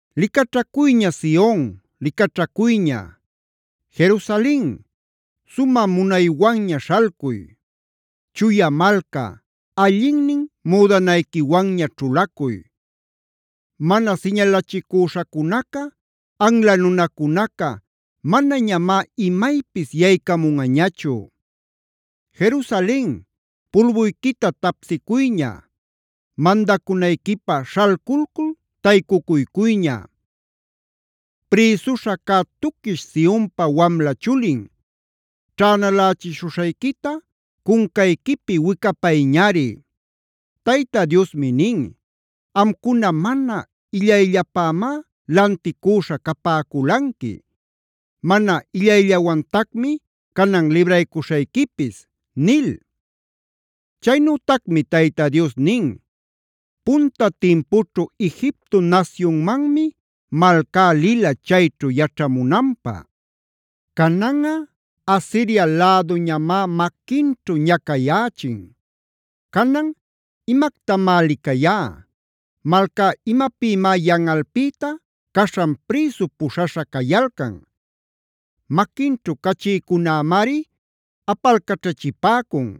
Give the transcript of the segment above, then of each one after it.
¡Licaćhacuyña Sion, licaćhacuyña! ¡Jerusalen, sumä munaywanña śhalcuy!a ¡Chuya malca, allinnin müdanayquiwanña ćhulacuy! ¡Mana siñalachicüśhacunaca, anla nunacunaca manañamá imaypis yaycamunꞌañachu! ¡Jerusalen, pulbuyquita tapsicuyña! ¡Mandacunayquipä śhalculcul taycucuycuyña! ¡Prïsuśha cä tuquish Sionpa wamla chulin, ćhänalächishuśhayquita cuncayquipi wicapayñari! Tayta Diosmi nin: “Amcuna mana illayllapämá lanticüśha capäculanqui. Mana illayllawantacmi canan libraycuśhayquipis” nil. Chaynütacmi Tayta Dios nin: “Punta timpućhu Egipto nasyunmanmi malcá lila, chayćhu yaćhamunanpä. Cananꞌa Asiria läduñamá maquinćhu ñacayächin. Canan ¿imactamá licayá? ¿Malcá imapïmá yanꞌalpïta caśhan prïsu puśhaśha cayalcan? Maquinćhu cachïcunämari apalcaćhachipäcun;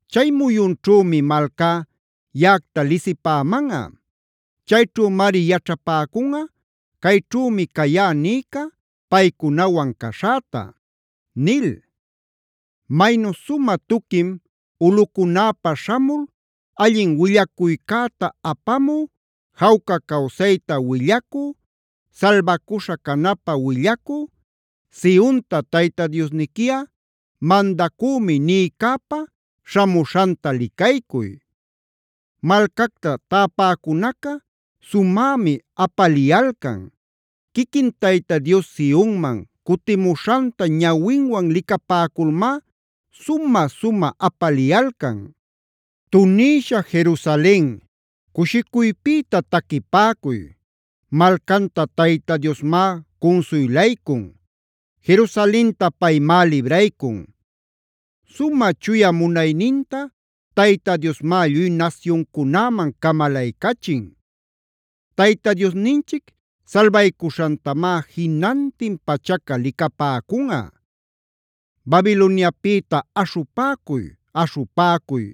Chay muyunćhümi malcá yaꞌacta lisipämanꞌa. Chayćhümari yaćhapäcunꞌa ‘cayćhümi cayá’ nïca paycunawan caśhäta” nil. Maynu sumä tuquim ulꞌucunäpa śhamul allin willacuycäta apamü, jawca cawsayta willacü, salbacuśha canapä willacü,c Sionta “Tayta Diosniquiꞌa mandacümi” nïcäpa śhamuśhanta licaycuy. ¡Malcacta täpäcunaca sumämi apaliyalcan! Quiquin Tayta Dios Sionman cutimuśhanta ñawinwan licapäculmá sumä-sumä apaliyalcan. Tunïsha Jerusalen, cushicuypïta taquipäcuy; malcanta Tayta Diosmá cunsuylaycun; Jerusalenta paymá libraycun. Sumä Chuya munayninta Tayta Diosmá lluy nasyuncunäman camalaycachin. Tayta Diosninchic salbaycuśhantamá jinantin pachaca licapäcunꞌa. ¡Babiloniapïta aśhupäcuy, aśhupäcuy!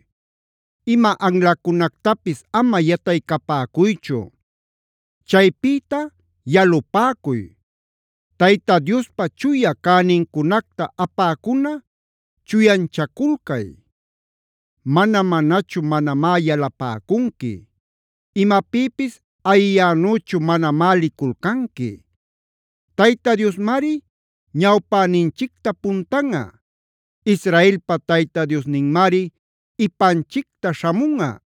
¡Ima anlacunactapis ama yataycapäcuychu!d ¡Chaypïta yalupäcuy! ¡Tayta Diospa Chuya cänincunacta apäcuna chuyanchaculcay! Mana-manachu manamá yalapäcunqui; imapïpis ayiyänüchu manamá liculcanqui. ¡Tayta Diosmari ñawpäninchicta puntanꞌa! ¡Israelpa Tayta Diosninmari ipanchicta śhamunꞌa!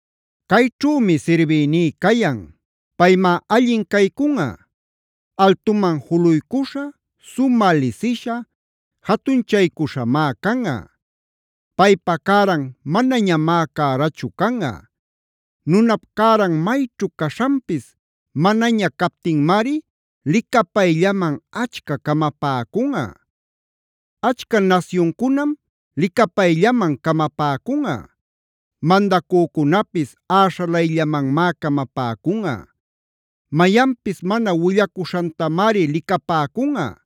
¡Cayćhümi sirbïní cayan! Paymá allin caycunꞌa; altuman juluycuśha, sumä lisisha, jatunchaycuśhamá canꞌa. Paypa cäran manañamá cärachu canꞌa; nunap cäran mayćhu caśhanpis manaña captinmari licapayllaman achca camapäcunꞌa. Achca nasyuncunam licapayllaman camapäcunꞌa; mandacücunapis äśhalayllamanmá camapäcunꞌa. Mayanpis mana willacuśhantamari licapäcunꞌa;